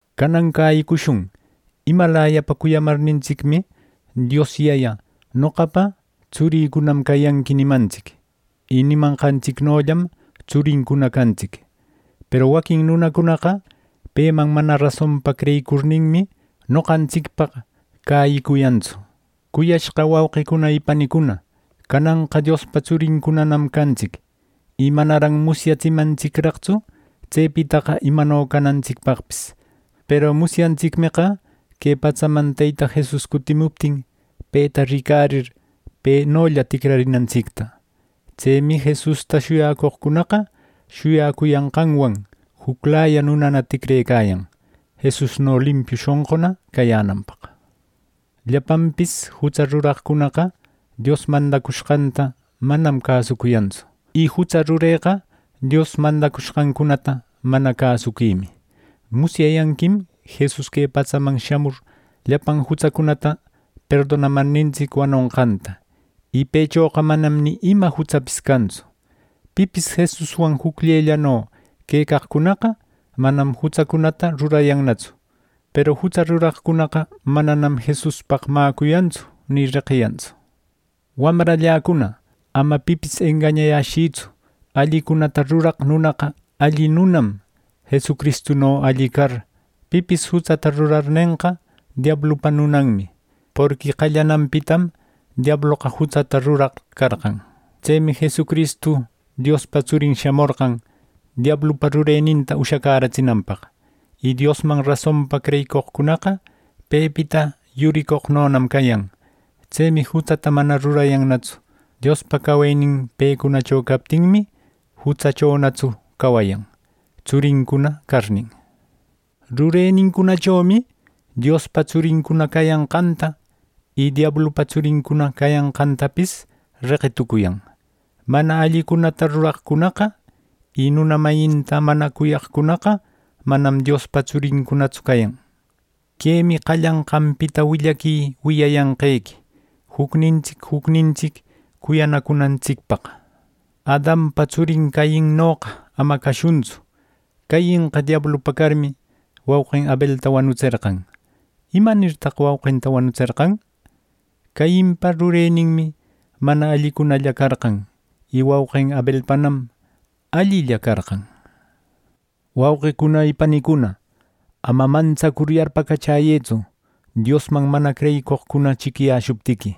Canan cäyicushun: Imalayapa cuyamarnintsicmi Dios Yaya “Noqapa tsurïcunam cayanqui” nimantsic. Y nimanqantsicnollam tsurincuna cantsic. Peru waquin nunacunaqa peman mana rasonpa creyicurninmi, noqantsicpaq cäyicuyantsu. Cuyashqa wauqicuna y panicuna, cananqa Diospa tsurincunanam cantsic. Y manaran musyatsimantsicraqtsu tsepitaqa imano canantsicpaqpis. Peru musyantsicmeqa que patsaman Teyta Jesus cutimuptin, peta ricarir, penolla ticrarinantsicta. Tsemi Jesusta shuyacoqcunaqa shuyacuyanqanwan juclaya nunana ticrecayan, Jesusno limpiu shonquna cayänanpaq. Llapanpis jutsa ruraqcunaqa Dios mandacushqanta manam cäsucuyantsu. Y jutsa rureqa Dios mandacushqancunata mana cäsuquimi. Musyayanquim Jesus que patsaman shamur llapan jutsacunata perdonamarnintsic wanonqanta. Y pëchoqa manam ni ima jutsapis cantsu. Pipis Jesuswan jucllellano quecaqcunaqa manam jutsacunata rurayannatsu; peru jutsa ruraqcunaqa mananam Jesuspaq mäcuyantsu ni reqiyantsu. Wamralläcuna, ama pipis engañayäshïtsu: Allicunata ruraq nunaqa alli nunam, Jesucristuno alli car. Pipis jutsata rurarnenqa, diablupa nunanmi; porqui qallananpitam diabloqa jutsata ruraq carqan. Tsemi Jesucristu Diospa Tsurin shamorqan diablupa rureninta ushacäratsinanpaq. Y Diosman rasonpa creyicoqcunaqa pepita yuricoqnonam cayan. Tsemi jutsata mana rurayannatsu. Diospa cawenin pecunacho captinmi, jutsachonatsu cawayan, tsurincuna carnin. Rurenincunachomi Diospa tsurincuna cayanqanta, y diablupa tsurincuna cayanqantapis reqitucuyan. Mana allicunata ruraqcunaqa, y nuna mayinta mana cuyaqcunaqa manam Diospa tsurincunatsu cayan. Quemi qallanqanpita willaqui wiyayanqequi: jucnintsic jucnintsic cuyanacunantsicpaq. Adanpa tsurin Cainnoqa ama cashuntsu. Cainqa diablupa carmi, wauqin Abelta wanutserqan. ¿Imanirtan wauqinta wanutserqan? Cainpa rureninmi mana allicunalla carqan; y wauqin Abelpanam allilla carqan. Wauqicuna y panicuna, ama mantsacur yarpacachäyëtsu, Diosman mana creyicoqcuna chiquiyäshuptiqui.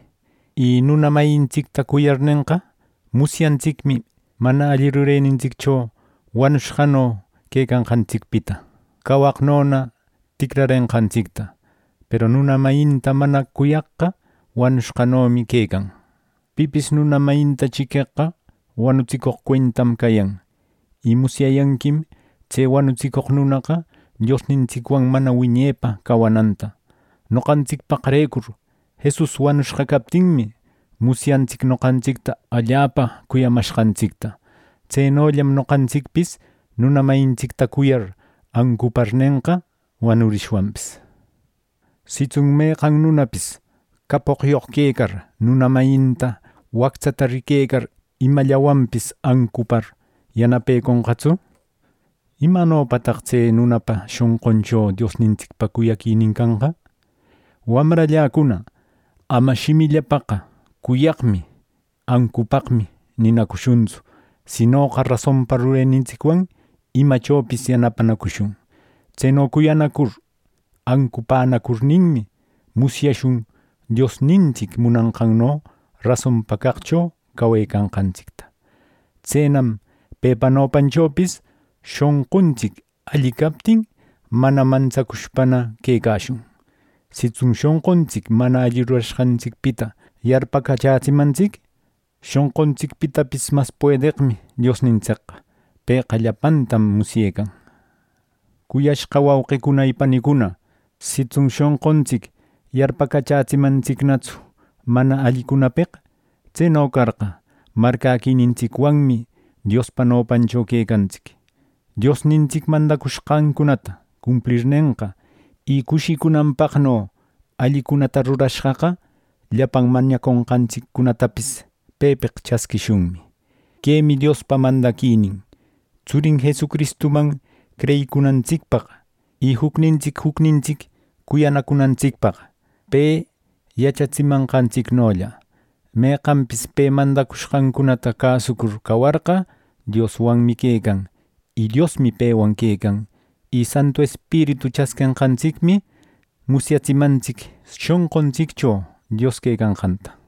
Y nuna mayintsicta cuyarnenqa, musyantsicmi mana alli rurenintsiccho wanushqano quecanqantsicpita cawaqnona ticrarenqantsicta. Peru nuna mayinta mana cuyaqqa wanushqanomi quecan. Pipis nuna mayinta chiqueqqa wanutsicoq cuentam cayan. Y musyayanquim tse wanutsicoq nunaqa Diosnintsicwan mana wiñepa cawananta. Noqantsicpaqrecur Jesus wanushqa captinmi, musyantsic noqantsicta allapa cuyamashqantsicta. Tsenollam noqantsicpis nuna mayintsicta cuyar ancuparnenqa wanurishwanpis. Sitsun meqan nunapis capoqyoq quecar, nuna mayinta wactsata riquecar, imallawanpis ancupar yanapeconqatsu; ¿imanopataq tse nunapa shonquncho Diosnintsicpa cuyaquinin canqa! Wamralläcuna, ama shimillapaqqa “Cuyaqmi, ancupaqmi” ninacushuntsu; sinoqa rasonpa rurenintsicwan imachopis yanapanacushun. Tseno cuyanacur ancupänacurninmi, musyashun Diosnintsic munanqanno rasonpa caqcho cawecanqantsicta. Tsenam pepa nopanchopis shonquntsic alli captin, mana mantsacushpana quecashun. Sitsun shonquntsic mana alli rurashqantsicpita yarpacachätsimantsic, shonquntsicpitapis mas puedeqmi Diosnintsicqa. Pëqa llapantam musyecan. Cuyashqa wauqicuna y panicuna, sitsun shonquntsic yarpacachätsimantsicnatsu mana allicunapeq, tseno carqa, marcäquinintsicwanmi Diospa nopancho quecantsic. Diosnintsic mandacushqancunata cumplirnenqa, y cushicunanpaqno allicunata rurashqaqa llapan mañaconqantsiccunatapis pepeq chasquishunmi. Quemi Diospa mandaquinin: Tsurin Jesucristuman creyicunantsicpaq, y jucnintsic jucnintsic cuyanacunantsicpaq, pe yachatsimanqantsicnolla. Meqanpis pe mandacushqancunata cäsucur cawarqa, Dioswanmi quecan, y Diosmi pewan quecan. Y Santu Espiritu chasquenqantsicmi musyatsimantsic shonquntsiccho Dios quecanqanta.